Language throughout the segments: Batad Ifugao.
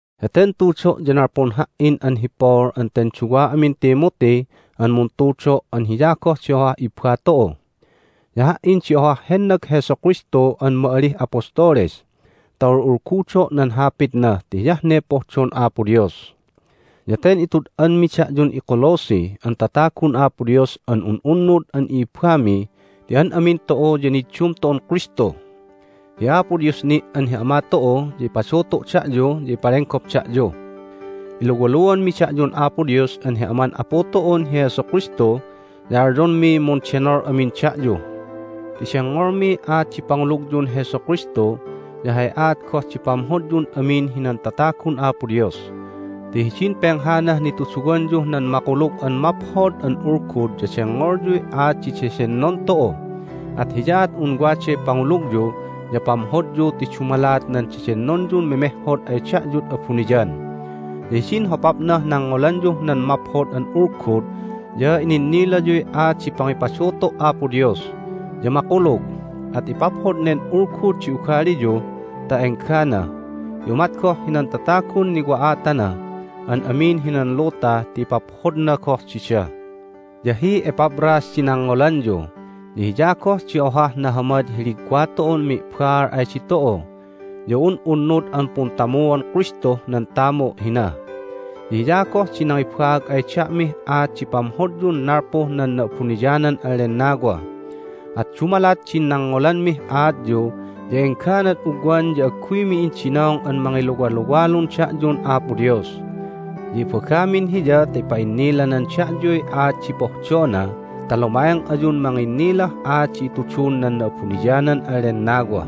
Heten tudo' ya nalpun ha"in an hi Paul an ten duwa amin Timothy an muntudo' an hiya goh di ohah ibba tu'u. Ya ha"in di ohah hennag Jesu Kristu an ma'alih apostoles ta ul'ulgudo' nan Hapitna ti hiyah ne pohdon Apo Dios. Ya ten itud'anmi da'yun iColosse an tatagun Apo Dios an un'unnud an i'ibbami ti an amin tu'u ya niddum tu'un Kristu. Hi Apo Dios ni' an hi Ama tu'u ya ipadutu' da'yu ya ipalenggop da'yu. Iluwaluanmi da'yun Apo Dios an hi Aman Apu tu'un hi Jesu Kristu, ya alyonmiy mundenol amin da'yu ti dengngolmiy aat di pangulugyun Jesu Kristu, ya hay aat goh di pamhodyun amin hinan tatagun Apo Dios. Ti hidin penghanah nituduwanyuh nan Makulug an Maphod an Ulgud ya dengngolyuy aat di dedennon tu'u, at hiyaat un waday pangulugyu ya pamhodyu ti dumalat nan dedennonyun memehhod ay da'yud abuniyan. Ya hidin hopapnah nangngolanyuh nan Maphod an Ulgud ya ininnilayuy aat di pangipadutu' Apo Dios, ya makulug. At ipaphod nen Ulgud di ugaliyu ta enggana, ya umat goh hinan tatagun niwa'atana an amin hinan luta ti ipaphodna goh dida. Ya hi Epaphras di nangngolanyu, ya hiya goh di ohah nahamad hi ligwa tu'un mi'baal ay ditu'u, ya un'unnud an puntamuon Kristuh nan tamu' hina. Ya hiya goh di nangibaag ay da'mih aat di pamhodyun nalpuh nan Na'abuniyanan an Lennawa. At dumalat din nangngolanmih aatyu ya engganad ugwan ya agguymi indinong an mangiluwaluwalun da'yun Apo Dios. Ya ibagamin Hiya ta ipa'innilanan da'yuy aat di pohdona ta luma'eng ayun manginnilah aat di itudun nan Na'abuniyanan an Lennawa.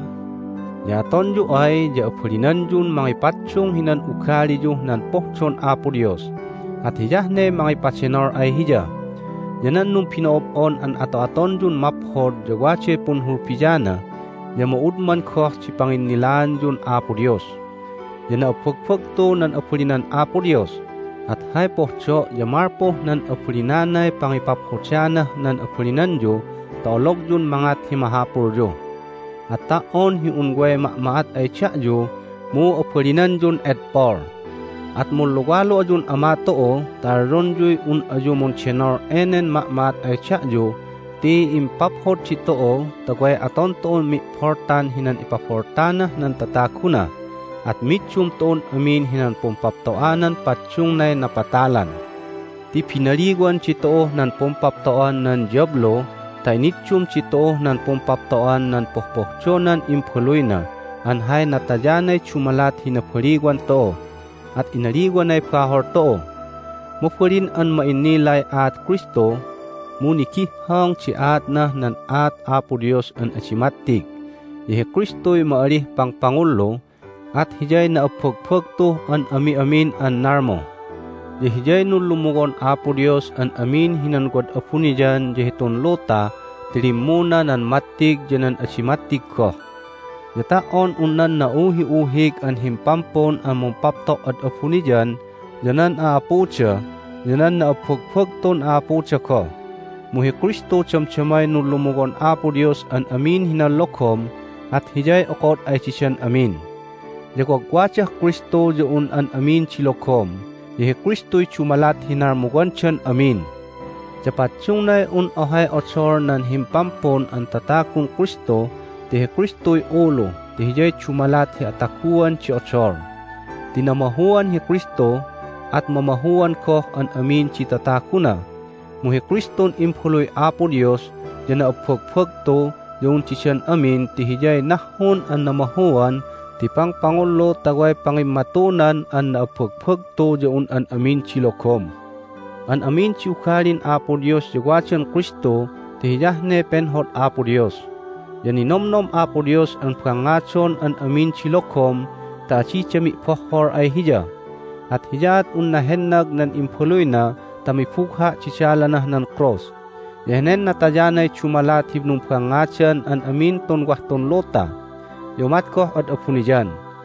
Ya atonyu ay ya abalinanyun mangipaddung hinan ugaliyuh nan pohdon Apo Dios, at hiyah ne mangipadenol ay Hiya. Ya nan numbino'ob'on an ato'atonyun maphod ya waday punhulbiana, ya ma'udman goh di panginnilaanyun Apo Dios. Ya na'abbagbagtu nan abalinan Apo Dios, at hay pohdo' ya malpuh nan abalinanay pangipaphodanah nan abalinanyu ta ologyun mangat hi mahapulyu. At ta"on hi un way ma'ma'at ay da'yu mu abalinanyun edpol. At munluwalu ayun Ama tu'u ta alyonyuy un ayu mundenol enen ma'ma'at ay da'yu ti impaphod ditu'u ta way aton tu'un mi'boltan hinan ipaboltanah nan tataguna, at middum tu'un amin hinan pumpapto'anan paddungnay napatalan. Ti binaliwan ditu'uh nan pumpapto'an nan diyablu ta iniddum ditu'uh nan pumpapto'an nan pohpohdonan Imbaluyna an hay natayanay dumalat hi nabaliwan tu'u, at inaliwanay bahol tu'u. Mabalin an ma'innilay aat Kristu, mu nigihhong di aatnah nan aat Apo Dios an adi mattig. Ya hi Kristuy ma'alih pangpangullu, at Hiyay na'abbagbagtuh an ami'amin an nalmu. Ya Hiyay nunlumuwon Apo Dios an amin hinan wad abuniyan ya hitun luta ti limmuna nan mattig ya nan adi mattig goh. Ya ta"on un nan na'uhi'uhig an himpampun an mumpapto' ad abuniyan, ya nan a'apuda, ya nan na'abbagbagtun a'apuda goh, mu hi Kristu damdamay nunlumuwon Apo Dios an amin hinan logom, at Hiyay okod ay didan amin. Ya wagwadah Kristu ya un an amin di logom, ya hi Kristuy dumalat hi nalmuwandan amin. Ya paddungnay un ohay odol nan Himpampun an Tatagun Kristu ti hi Kristuy ulu ti Hiyay dumalat hi ataguan di odol. Ti namahuan hi Kristu, at mamahuan goh an amin di tataguna, mu hi Kristun Imbaluy Apo Dios ya na'abbagbagtu ya un didan amin ti Hiyay nahhun an namahuan ti pangpangullu ta way pangimmatunan an na'abbagbagtu ya un an amin di logom. An amin di ugalin Apo Dios ya wadan Kristu ti hiyah ne penhod Apo Dios. Ya ninomnom Apo Dios an bangngadon an amin di logom ta adida mi'bohhol ay Hiya. At hiyaat unna hennag nan Imbaluyna ta mibugha' di dalanah nan krus. Ya henen natayanay dumalat hi numbangngadan an amin tun wah tun luta, ya umat goh ad abuniyan.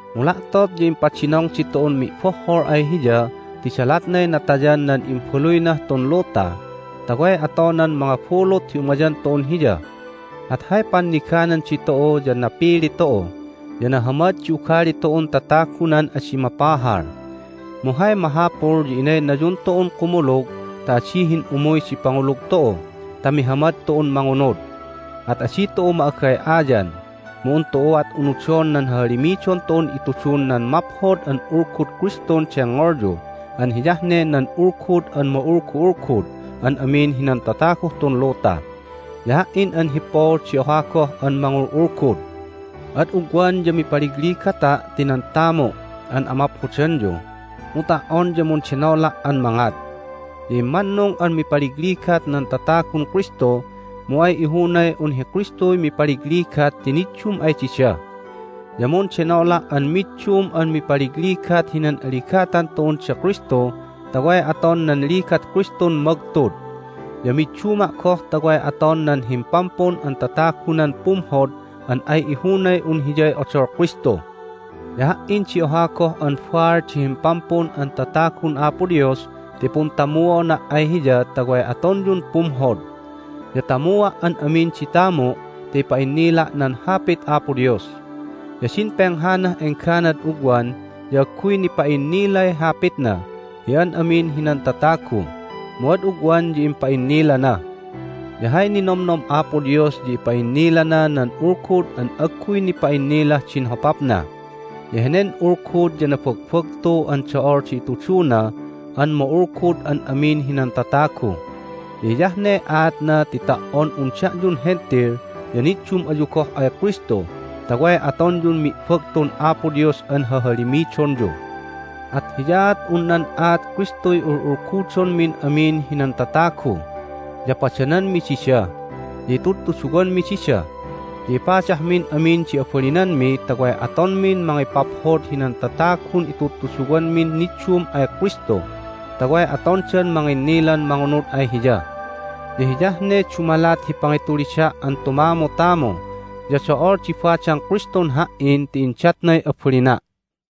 Mu la'tot ya impadinong ditu'un mi'bohhol ay Hiya ti dalatnay natayan nan Imbaluynah tun luta, ta way atonan mangabulut hi umayan tu'un Hiya. At hay panniganan ditu'u ya napili tu'u, ya nahamad di ugali tu'un tatagunan adi mapahal. Mu hay mahapul ya inaynayun tu'un kumulug ta adi hin'umuy di pangulug tu'u ta mihamad tu'un mangunud. At adi tu'u ma'agay'ayan, mu un tu'uat unudon nan hahalimidon tu'un itudun nan Maphod an Ulgud Kristun dengngolyu an hiyah ne nan Ulgud an ma'ulgu'ulgud an amin hinan tataguh tun luta. Ya ha"in an hi Paul di oha goh an mangul'ulgud. Ad ugwan ya mipaligligata' ti nan tamu' an amaphodanyu, mu ta"on ya mundenola' an mangat. Ya immannung an mipaligligat nan tatagun Kristu, mu ay ihunay un hi Kristuy mipaligligat ti niddum ay dida. Ya mundenola' an middum an mipaligligat hinan aligatan tu'un da Kristu ta way aton nan ligat Kristun magtud. Ya midduma' goh ta way aton nan Himpampun an Tatagunan pumhod an ay ihunay un hiyay odol Kristu. Ya ha"in di oha goh an baal di Himpampun an Tatagun Apo Dios ti puntamuona' ay Hiya ta way atonyun pumhod. Ya tamua' an amin di tamu' ta ipa'innila' nan Hapit Apo Dios. Ya din penghanah engganad ugwan ya agguy nipa'innilay Hapitna hi an amin hinan tatagu, mu ad ugwan ya impa'innilana. Ya hay ninomnom Apo Dios ya ipa'innilana nan Ulgud an agguy nipa'innilah din hopapna. Ya henen Ulgud ya nabagbagtu an do'ol di ituduna an ma'ulgud an amin hinan tatagu. Ya hiyah ne aatna ti ta"on un da'yun Hentil ya niddum ayu goh ay Kristu ta way atonyun mi'bagtun Apo Dios an hahalimidonyu. At hiyaat un nan aat Kristuy ul'ulgudonmin amin hinan tatagu. Ya padananmi dida, ya itudtuduwanmi dida, ya ipadahmin amin di abalinanmi ta way atonmin mangipaphod hinan tatagun itudtuduwanmin niddum ay Kristu ta way atondan manginnilan mangunud ay Hiya. Ya hiyah ne dumalat hi pangitulida' an tumamutamu, ya do'ol di badang Kristun ha"in ti indatnay abalina'.